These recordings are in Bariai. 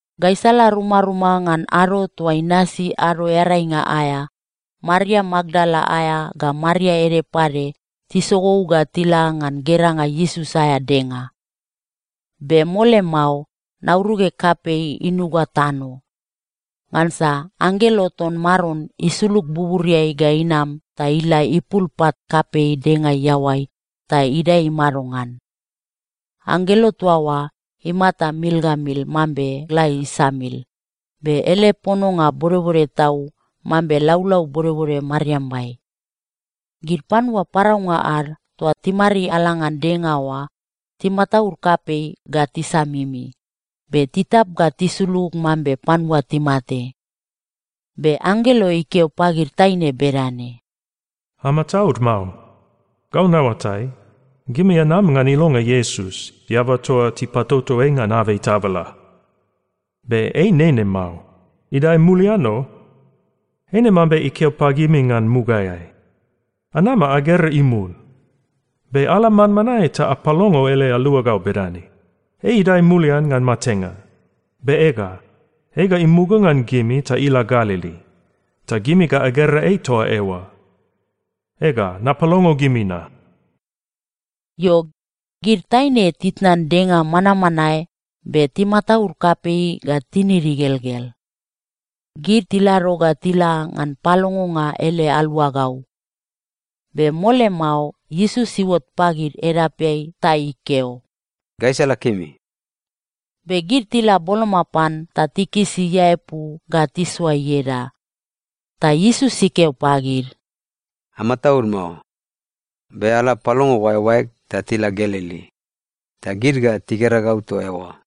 Gaisala rumaruma ngan ado toa inasi Ado Earainga aea, Maria Makdala aea ga Maria ede pade tisogou ga tila ngan geranga Iesus aea denga. Be mole mao, nauruge kapei inuga tano. Ngansa anggelo ton Maron isulug buburiai ga inam ta ila ipul pat kapei denga iaoai ta idae imado ngan. Anggelo toa oa imata mil ga mil mambe gla isamil, be ele pononga bodbode tau mambe laulau bodbode mariambai. Gid panua paraunga ad toa timariala ngan denga oa timataud kapei ga tisamimi, be titap ga tisulug mambe panua timate. Be anggelo ikeo pagid taine bedane, “Amataud mao. Gau naoatai, gimi anam ngan ilonga Iesus, eaba toa tipatoto ei ngan abei tabala. Be ei nene mao. Idae mulian o! Eine mambe ikeo pagimi ngan mugaeai. Anama agera imul. Be ala manmanae ta apalongo ele aluagau bedane, ‘Ei idae mulian ngan matenga! Be ega, ei ga imuga ngan gimi ta ila Galili. Ta gimi ga agera ei toa eoa.’ Ega, napalongo gimi na.” Io, gid taine titnan denga manmanae be timataud kapei ga tinid igelgel. Gid tilado ga tila ngan palongonga ele aluagau. Be mole mao Iesus iuot pagid edapeai ta ikeo, “Gaisala kemi.” Be gid tila boloma pan ta tikisi iaepu ga tisoa ieda. Ta Iesus ikeo pagid, “Amataud mao. Be ala apalongo oaeoaeg ta tila Galili. Ta gid ga tigera gau toa eoa.”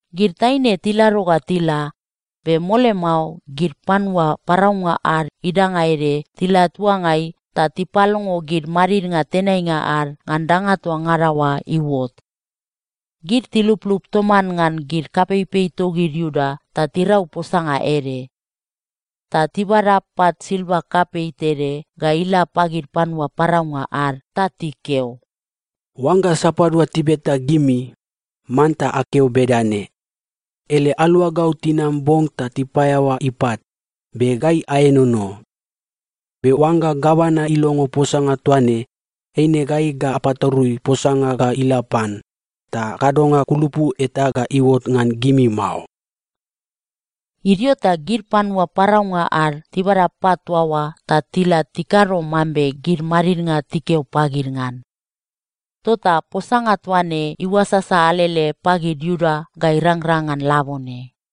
Gid taine tilado ga tila, be mole mao gid panua paraunga ad idanga ede tila tuangai ta tipalongo gid madidnga tenainga ad ngan danga toa ngada oa iuot. Gid tiluplup toman ngan gid kapeipei togid Iuda ta tirau posanga ede. Ta tibada pat silva kapei tede ga ila pagid panua paraunga ad ta tikeo, “Oangga sapadua tibeta gimi, manta akeo bedane, ‘Ele aluagau tinam bong ta tipaeaoa ipat, be gai aenono.’ Be oangga gavana ilongo posanga toa ne, eine gai ga apatarui posanga ga ila pan, ta kadonga kulupu eta ga iuot ngan gimi mao.” Idio ta gid panua paraunga ad tibada pat toa oa ta tila tikado mambe gid madidnga tikeo pagid ngan. Tota posanga toa ne iuasasa alele pagid Iuda ga irangrang ngan labone.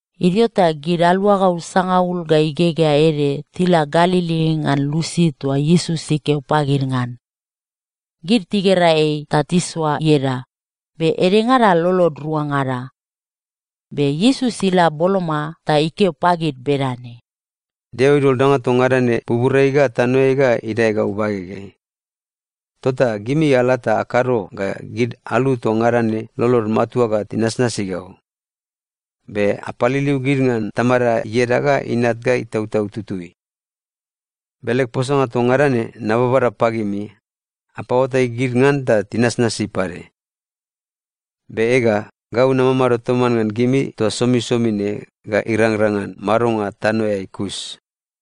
Idio ta gid aluagau sangaul ga igegea ede tila Galili ngan lusi toa Iesus ikeo pagid ngan. Gid tigera ei ta tisoa ieda, be edengada lolod ruangada. Be Iesus ila boloma ta ikeo pagid bedane, “Deo idol danga toa ngada ne buburiai ga tanoeai ga idae gau bagegeai. Tota gimi ala ta akado ga gid alu toa ngada ne lolod matua ga tinasnasi gau. Be apaliliu gid ngan Tamada ieda ga Inat ga Itautau Tutui. Be leg posanga toa ngada ne nababada pagimi, apaoatai gid ngan ta tinasnasi pade. Be ega, gau namamado toman ngan gimi toa somisomi ne ga irangrang ngan madonga tanoeai kus.”